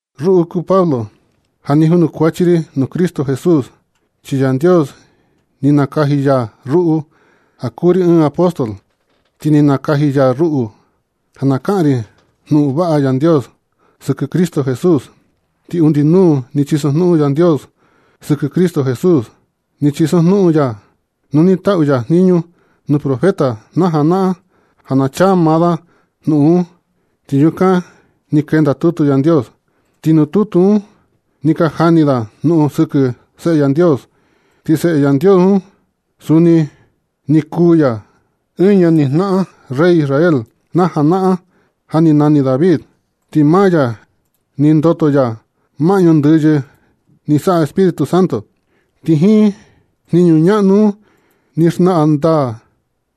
Ruꞌu kuu Pablo ja junukuachi ri nuu Cristo Jesús, chi Yandios ni nakaji ya ruꞌu ja kuu ri ɨɨn apóstol, ti ni nakaji ya ruꞌu ja na kaꞌan ri jnuꞌun vaꞌa Yandios sɨkɨ Cristo Jesús. Ti undi nuu ni chisojnuꞌun Yandios sɨkɨ Cristo Jesús. Ni chisojnuꞌun ya un nu ni taꞌu ya jniñu nuu profeta na janaꞌan ja na chaa maa da jnuꞌun un, ti yukan ni kenda tutu Yandios. Ti nuu tutu un ni ka jani da jnuꞌun sɨkɨ Seꞌe Yandios. Ti Seꞌe Yandios un, suni ni kuu ya ɨɨn ñanijnaꞌan rey Israel na janaꞌan ja ni nani David. Ti maa ya ni ndoto ya maꞌñu ndɨyɨ ni saꞌa Espíritu Santo, ti jiin jniñu ñaꞌnu un ni xnaꞌan ndaa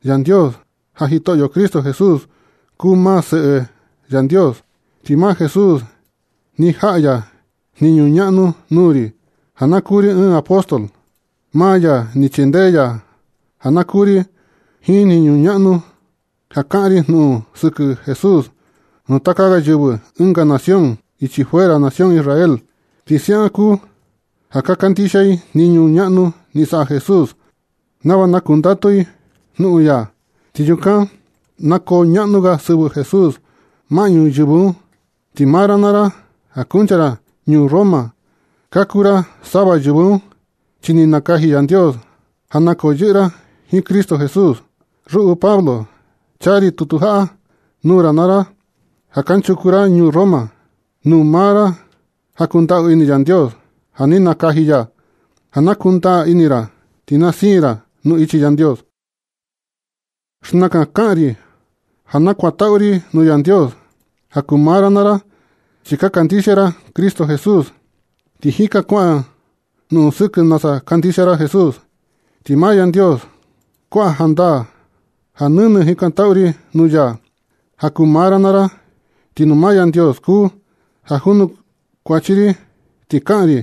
Yandios ja Jitoꞌyo Cristo Jesús kuu maa Seꞌe Yandios. Ti maa Jesús ni jaꞌa ya jniñu ñaꞌnu nuu ri ja na kuu ri ɨɨn apóstol. Maa ya ni chindee ya ja na kuu ri jiin jniñu ñaꞌnu un ja kaꞌan ri jnuꞌun sɨkɨ Jesús nuu taka ga yɨvɨ ɨnga nación ichi fuera nación Israel. Ti siaꞌan kuu ja ka kandixia i jniñu ñaꞌnu ni saꞌa Jesús nava na kundatu i jnuꞌun ya. Ti yukan na koo ñaꞌnu ga sɨvɨ Jesús maꞌñu yɨvɨ un. Ti maa ra naa ra, ja kuncha ra ñuu Roma, ka kuu ra sava yɨvɨ un, chi ni nakaji Yandios ja na yɨꞌɨ ra jiin Cristo Jesús. Ruꞌu Pablo, chaa ri tutu jaꞌa nuu ra naa ra ja kanchuku ra ñuu Roma, nuu maa ra ja kundaꞌu ini Yandios, ja ni nakaji ya ja na kundaa ini ra ti na siin ra nuu ichi Yandios. Xnakan kaꞌan ri ja nakuantaꞌu ri nuu Yandios ja kuu maa ra naa ra, chi ka kandixia ra Cristo Jesús. Ti jika kuaꞌan jnuꞌun sɨkɨ nasa kandixia ra Jesús. Ti maa Yandios kuaꞌa jandaa ja nɨnɨ jikantaꞌu ri nuu ya ja kuu maa ra naa ra, ti nuu maa Yandios kuu ja janukuachi ri ti kaꞌan ri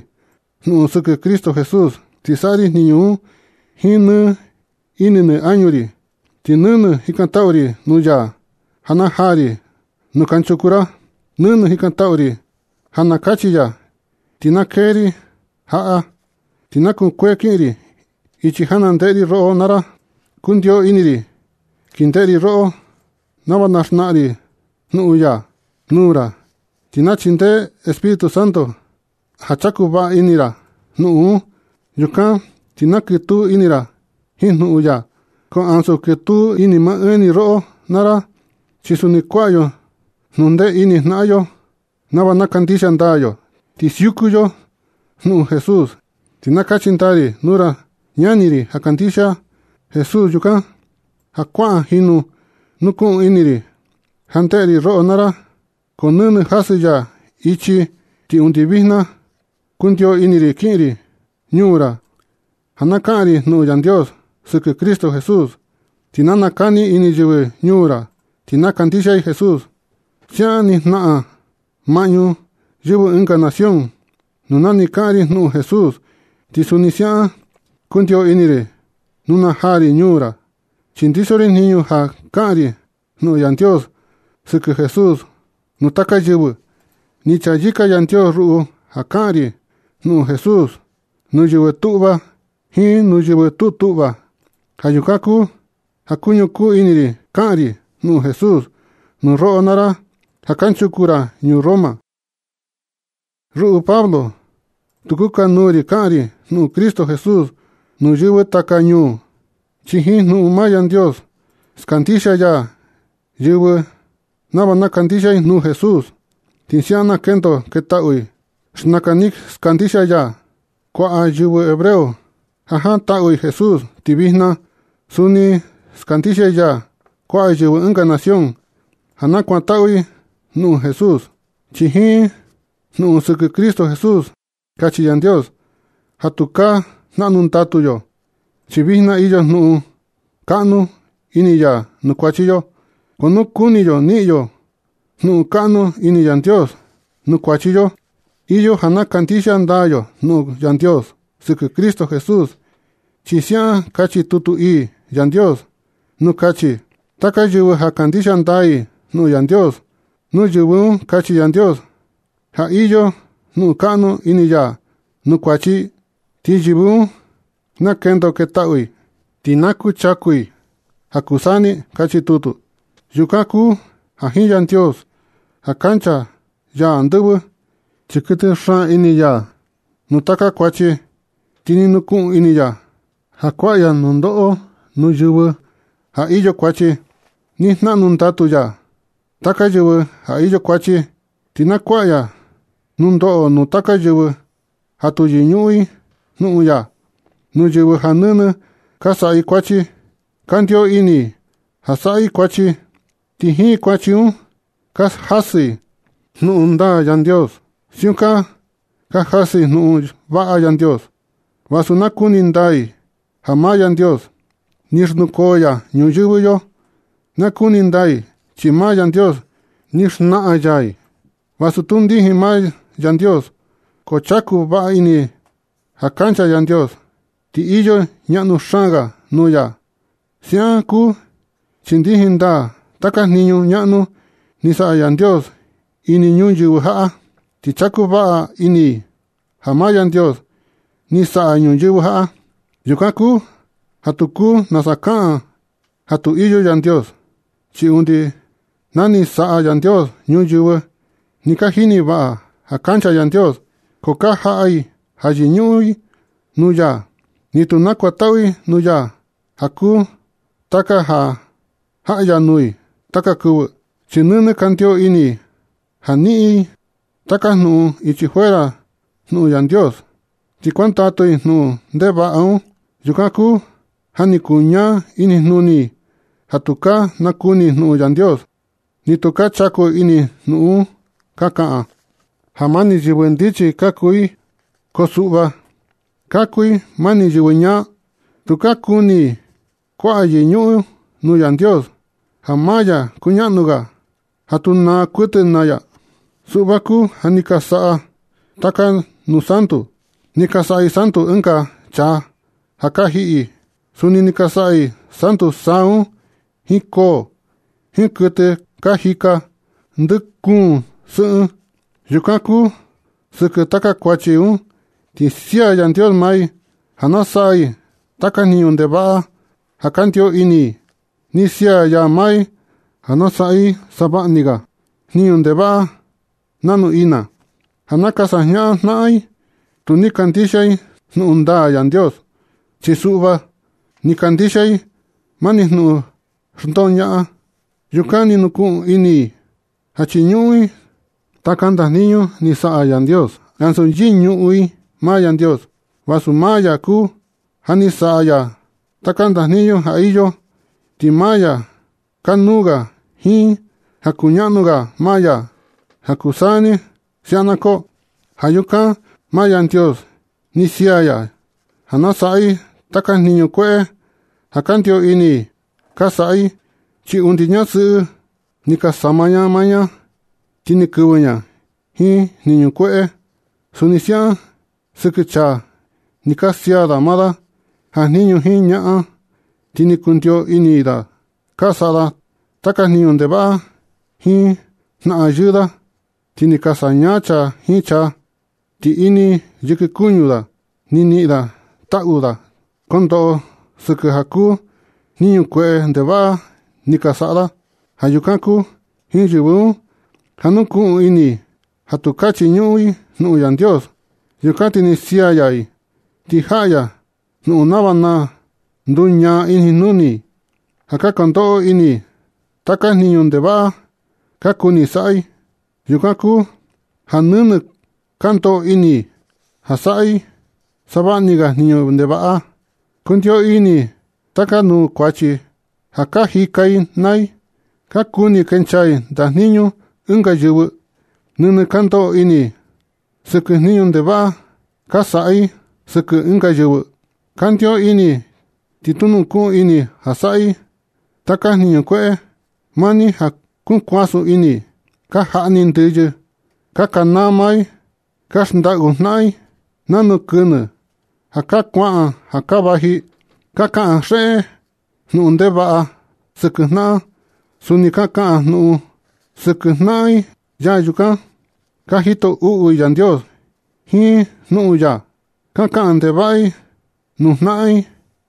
jnuꞌun sɨkɨ Cristo Jesús, ti saꞌa ri jniñu un jiin nɨ ini nɨ añu ri. Ti nɨnɨ jikantaꞌu ri nuu ya ja na jaa ri nuu kanchuku ra. Nɨnɨ jikantaꞌu ri ja na kachi ya ti na kee ri jaꞌa, ti na kukuee kin ri ichi ja na jandeꞌe ri roꞌo naa ra. Kundio ini ri kindeꞌe ri roꞌo nava na xnaꞌan ri jnuꞌun ya nuu ra, ti na chindee Espíritu Santo ja chaku vaꞌa ini ra jnuꞌun un. Yukan ti na kɨtuu ini ra jiin jnuꞌun ya. Ko ansu kɨtuu ini maa ɨɨn ni roꞌo naa ra, chi suni kuaꞌa yo jnundee ini jnaꞌan yo naa yo nava na kandixia ndaa yo, ti siuku yo jnuꞌun Jesús. Ti na kachi ndaa ri nuu ra ñani ri ja kandixia Jesús yukan, ja kuaꞌa jinu nukuꞌun ini ri ja jandeꞌe ri roꞌo naa ra, ko nɨnɨ jasɨ ya ichi ti undi vijna. Kundio ini ri kiꞌin ri ñuu ra ja na kaꞌan ri jnuꞌun Yandios sɨkɨ Cristo Jesús, ti na nakani ini yɨvɨ ñuu ra ti na kandixia i Jesús. Siaꞌan ni jnaꞌan maꞌñu yɨvɨ ɨnga nación nuu ni kaꞌan ri jnuꞌun Jesús, ti suni siaꞌan kundio ini ri nu na jaa ri ñuu ra. Chi ndiso ri jniñu ja kaꞌan ri jnuꞌun Yandios sɨkɨ Jesús nuu taka yɨvɨ. Ni chayɨka Yandios ruꞌu ja kaꞌan ri jnuꞌun Jesús nuu yɨvɨ tuꞌva jiin nuu yɨvɨ tu tuꞌva. Ja yukan kuu ja kuñukuu ini ri kaꞌan ri jnuꞌun Jesús nuu roꞌo naa ra ja kanchuku ra ñuu Roma. Ruꞌu Pablo, tu kukanuu ri kaꞌan ri jnuꞌun Cristo Jesús nuu yɨvɨ taka ñuu, chi jiin jnuꞌun maa Yandios skandixia ya yɨvɨ nava na kandixia i nuu Jesús, ti siaꞌan na kendo ketaꞌu i. Xnakan ni skandixia ya kuaꞌa yɨvɨ hebreo ja jantaꞌu i Jesús, ti vijna suni skandixia ya kuaꞌa yɨvɨ ɨnga nación ja na kuantaꞌu i jnuꞌun Jesús, chi jiin jnuꞌun sɨkɨ Cristo Jesús kachi Yandios ja tukaa jnaꞌnu ndatu yo, chi vijna iyo jnuꞌun kaꞌnu ini ya nuu kuachi yo. Ko nu kuni yo niꞌin yo jnuꞌun kaꞌnu ini Yandios nuu kuachi yo, iyo ja na kandixia ndaa yo jnuꞌun Yandios sɨkɨ Cristo Jesús, chi siaꞌan kachi tutu ii Yandios nuu kachi: “Taka yɨvɨ ja kandixia ndaa i jnuꞌun Yandios, nuu yɨvɨ un kachi Yandios ja iyo jnuꞌun kaꞌnu ini ya nuu kuachi i, ti yɨvɨ un na kendo ketaꞌu i, ti na kuchaku i ja kuu saa ni”, kachi tutu. Yukan kuu ja jiin Yandios ja kancha ya andɨvɨ, chi kuɨtɨ xaan ini ya nuu taka kuachi, ti ni nukuꞌun ini ya ja kuaꞌa ya nundoꞌo nuu yɨvɨ ja iyo kuachi. Ni jnaꞌnu ndatu ya taka yɨvɨ ja iyo kuachi, ti na kuaꞌa ya nundoꞌo nuu taka yɨvɨ ja tu yɨñuꞌun i jnuꞌun ya, nuu yɨvɨ ja nɨnɨ ka saꞌa i kuachi. Kandio ini ja saꞌa i kuachi, ti jiin kuachi un ka jasɨ i jnuꞌun ndaa Yandios. Siukan ka jasɨ i jnuꞌun vaꞌa Yandios vasu nakuni ndaa i ja maa Yandios ni xnukoo ya ñuyɨvɨ yo. Nakuni ndaa i chi maa Yandios ni xnaꞌan ya i. Vasu tu ndijin maa Yandios, ko chaku vaꞌa ini i ja kancha Yandios ti iyo ñaꞌnu xaan ga nuu ya. Siaꞌan kuu chi ndijin ndaa taka jniñu ñaꞌnu ni saꞌa Yandios ini ñuyɨvɨ jaꞌa, ti chaku vaꞌa ini i ja maa Yandios ni saꞌa ñuyɨvɨ jaꞌa. Yukan kuu ja tu kuu nasa kaꞌan i ja tu iyo Yandios. Chi undi na ni saꞌa Yandios ñuyɨvɨ ni ka jini vaꞌa ja kancha Yandios, ko ka jaꞌa i ja yɨñuꞌun nuu ya, ni tu nakuantaꞌu i nuu ya ja kuu taka ja jaꞌa ya nuu i taka kɨvɨ. Chi nɨnɨ kandio ini i ja niꞌin i taka jnuꞌun ichi fuera jnuꞌun Yandios ti kuandatu i jnuꞌun ndevaꞌa un. Yukan kuu ja ni kuñaa inijnuni i ja tukaa nakuni i jnuꞌun Yandios, ni tu chaku ini i jnuꞌun un. Ka kaꞌan i ja mani yɨvɨ ndichi ka kuu i, ko suꞌva ka kuu i mani yɨvɨ ñaa. Tu ka kuni i kuaꞌa yɨñuꞌun nuu Yandios ja maa ya kuñaꞌnu ga, ja tu naa kuɨtɨ naa ya. Suꞌva kuu ja ni ka saꞌa i taka nuu santu. Ni ka saꞌa i santu ɨnga chaa ja ka jiꞌi. Suni ni ka saꞌa i santu saa un, jiin koo, jiin kuɨtɨ ka jika tɨ ndɨ kuun sɨꞌɨn. Yukan kuu sɨkɨ taka kuachi un, ti sia Yandios maa i ja na saꞌa i taka jniñu ndevaꞌa ja kandio ini i. Ni sia ya maa i ja na saꞌa i savaꞌa ni ga jniñu ndevaꞌa nanu ina, ja na ka sajñaꞌan jnaꞌan i. Tu ni kandixia i jnuꞌun ndaa Yandios, chi suꞌva ni kandixia i mani jnuꞌun xndoñaꞌan. Yukan ni nukuꞌun ini i ja chiñuꞌun i taka ndajnijñu ni saꞌa Yandios ansu yɨñuꞌun i maa Yandios, vasu maa ya kuu ja ni saꞌa ya taka ndajniñu ja iyo, ti maa ya kanuu ga jiin ja kuñaꞌnu ga maa ya ja kuu ja kuu saa ni. Siaꞌan na koo. Ja yukan maa Yandios ni sia ya i ja na saꞌa i taka jniñu kueꞌe ja kandio ini ka saꞌa i. Chi undi ñasɨꞌɨ ni ka sama ña maa ña sɨꞌɨ, ti ni kɨvɨ ña jiin jniñu kueꞌe. Suni siaꞌan sɨkɨ chaa ni ka sia da maa da jajniñu jiin ñaꞌan, ti ni kundio ini da ka saꞌa da taka jniñu ndevaꞌa jiin jnaꞌan yɨɨ da. Ti ni ka sañaa chaa jiin chaa. Ti ini yɨkɨ kuñu da ni niꞌin da taꞌu ja kondoꞌo sɨkɨ ja kuu jniñu kueꞌe ndevaꞌa ni ka saꞌa da. Ja yukan kuu jiin yɨvɨ un, ja nukuꞌun ini i ja tukaa chiñuꞌun i jnuꞌun Yandios. Yukan ti ni sia ya i, ti jaꞌa ya jnuꞌun nava na nduñaa inijnuni i, ja ka ndoꞌo ini i taka jniñu ndevaꞌa ka kuni saꞌa i. Yukan kuu ja nɨnɨ ka ndoꞌo ini i ja saꞌa i savaꞌa ni ga jniñu ndevaꞌa. Kundio ini taka nuu kuachi ja ka jika i naa i. Ka kuni kencha i ndajniñu ɨnga yɨvɨ. Nɨnɨ ka ndoꞌo ini i sɨkɨ jniñu ndevaꞌa ka saꞌa i sɨkɨ ɨnga yɨvɨ. Kandio ini ti nukuꞌun ini ja saꞌa i taka jniñu kueꞌe. Mani ja kukuasun ini i. Ka jaꞌni i ndɨyɨ. Ka kanaa maa i. Ka xndaꞌu jnaꞌan i. Nanu kɨnɨ ja ka kuaꞌan ja ka vaji. Ka kaꞌan xeꞌe i jnuꞌun ndevaꞌa sɨkɨ jnaꞌan. Suni ka kaꞌan jnuꞌun sɨkɨ jnaꞌan i yee yukan. Ka jito uꞌu i Yandios jiin jnuꞌun ya. Ka kaꞌan ndevaꞌa i nuu jnaꞌan i,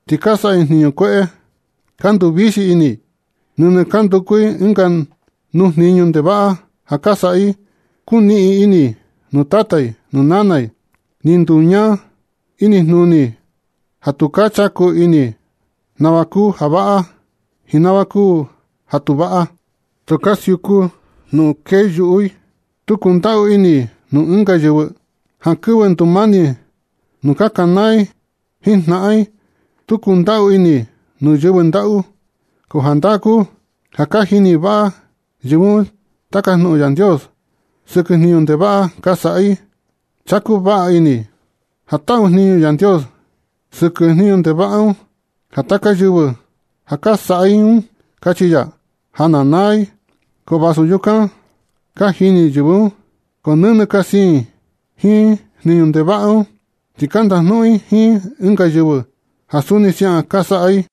ti ka saꞌa i jniñu kueꞌe. Ka nduvixi ini. Nɨnɨ ka nduku i ɨnga nuu jniñu ndevaꞌa ja ka saꞌa i. Kuniꞌin ini i nuu tata i nuu nana i. Ni nduñaa inijnuni i ja tukaa chaku ini nava kuu ja vaꞌa jiin nava kuu ja tu vaꞌa. Tu ka siuku jnuꞌun kee yuꞌu i. Tu kundaꞌu ini i nuu ɨnga yɨvɨ. Jankɨvɨ ndumani nu ka kanaa i jiin jnaꞌan i. Tu kundaꞌu ini i nuu yɨvɨ ndaꞌu. Ko jandaa kuu ja ka jini vaꞌa yɨvɨ un taka jnuꞌun Yandios sɨkɨ jniñu ndevaꞌa ka saꞌa i. Chaku vaꞌa ini i ja taꞌu jniñu Yandios sɨkɨ jniñu ndevaꞌa un ja taka yɨvɨ ja ka saꞌa i un, kachi ya ja na naa i. Ko vasu yukan ka jini yɨvɨ un, ko nɨnɨ ka siin i jiin jniñu ndevaꞌa un, ti ka ndajnuꞌun i jiin ɨnga yɨvɨ ja suni siaꞌan ka saꞌa i.